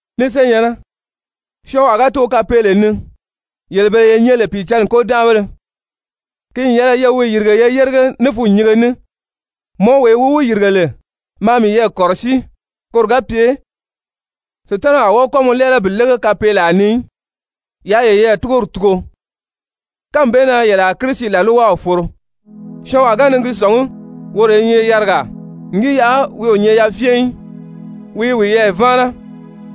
Ni senyɛ̀nnɛ, syɔɔnwaa ga too kapeele ni, yele bele ye nyɛ lè Pìicǎnni kôdanʔabéle, ki n yɛlɛ ye wi yìrige ye yérige ní fûnnyinge ní. Mɔ wee wi wi yìrige lè, maa miyɛɛ kɔ̀rɔsíi koro ga pye Sutanaw a wɔ́ɔ kɔ́ mɔ lɛ́ɛlɛ bi lége kapeelaa ni í. Yaa yeyɛɛ túgori tugu, kánmi bee na yele a Kirisi làlwaw foro. Syɔɔnwaa ga ni gi sɔ̀ngí woro i nyɛ yarigaa n gi yaʔa wi o nyɛ yafyɛn í, wi i wiyɛɛ váana.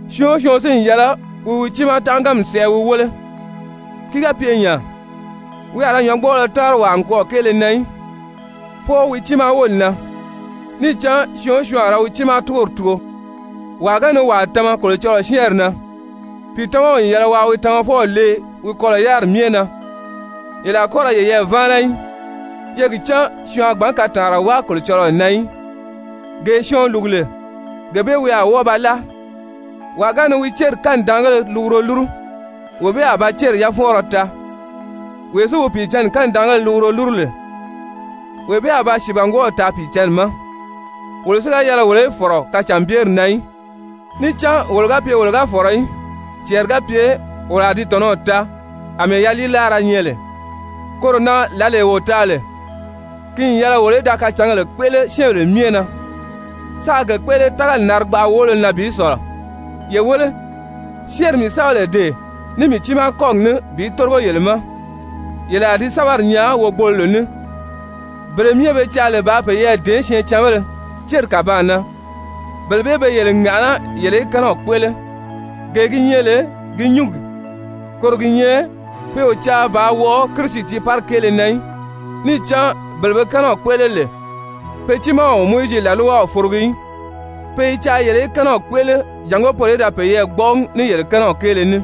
Syɔɔn o syɔɔn si n yɛlɛ wi wi tiimaa tánʔaganmi sɛʔɛ wi wéle, ki ga pye nya, wi a ra nyɔ̌ngbɔɔlɔ táanri wàa nikwɔɔ kéele na í, fwɔɔ wi tiimaa wóli na. Níì cán syɔɔn o syɔɔn a ra wi tiimaa túgori tugu. Wàa ga ni wàa tama Kolocɔlɔɔ syɛ́ɛnri na, pìitamaw n yɛlɛ waa wi tamafɔw lee wi kɔlɔ̀ yáriri myɛ na. Yele a kɔ́ ra yeyɛɛ váana í, ye gi cán syɔɔn a gbǎn kataanra wáa Kolocɔlɔɔ na í. Gee syɔɔn lùgu lè, gee bee wi a wɔ́ɔ ba láa. Wàa ga ni wi céri kanidaangéle luguro lúru, wee bee a ba céri yafɔnʔɔrɔ taa. Wee si wi Pìicǎnni kanidaanna luguro lúru lè, wee bee a ba sìibangwɔɔw taa Pìicǎnni ma. Wolo si ga yɛlɛ wolo í fɔ̀rɔ kacànbyeri na í. Níì cán wolo ga pye wolo ga fɔ̀rɔ í, cɛɛri ga pye wolo a di tɔ̀nɔw taa àmɛɛ yaliilaara nyɛ lè. Koro na lǎlee wo taa lè, ki n yɛlɛ wolo í da kacǎngèle kpéʔele syɛ́ɛnbèle myɛ na, sáā ge kpéʔele tágali narigbaʔa woolo na bi sɔ̀lɔ. Ye wéle, syɛ́ɛnri mii sɛ́bɛ lè dee ní mii tiimaa kɔ́gi ní bi tórigo yele ma, yele a di sɛ́bɛri nyaa wogboloro ní. Bele myɛ be caa lè bàā peyɛɛ dèé syɛɛncanbéle céri kàbaan na, bele bee be yele ŋàʔaná yele í kɛ́nɛw kpéʔele, gee gi nyɛ lè gi nyúngi, koro gi nyɛ pe o caa bàā wɔʔɔ Kirisi tiiparigi kéele na í. Níì cán bele be kɛ́nɛw kpéʔele lè, pe tiimaa o Mowizi làlwaw forogi í. Pe i caa yele í kɛ́nɛw kpéʔele jàngó poro í da peyɛɛ gbɔ́ʔɔgi ní yele kɛ́nɛw kéele ní.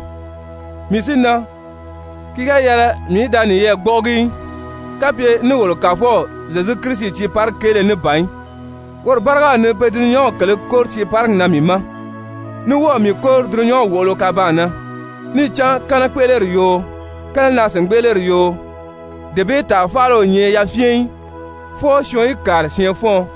Mii si na, ki ga yɛlɛ mii í da niyɛɛ gbɔ́ʔɔgi í, kapye ní wolo Kàfɔw Zyezu Kirisi tiiparigi kéele ní ban í, woro bárigaw ni pe dulunyanw kèlē kóri tiiparigi na mii ma, ní wɔ́ɔ̀ mii kóri dulunyanw wòʔolo kabaan na! Níì cán kɛ́nɛkpeʔeleri yoo, kɛ́nɛnaa-sìngbeʔeleri yoo, dee bee tàa faala o nyɛ yafyɛn í, fwɔɔ syɔɔn í kàri syɛɛnfɔ́ɔn.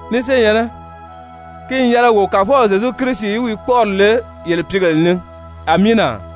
Ni senyɛ̀nnɛ, ki n yɛlɛ wo Kàfɔw Zyezu Kirisi í wi kpɔ́ʔɔri le yele pìígèle ni! Amiina!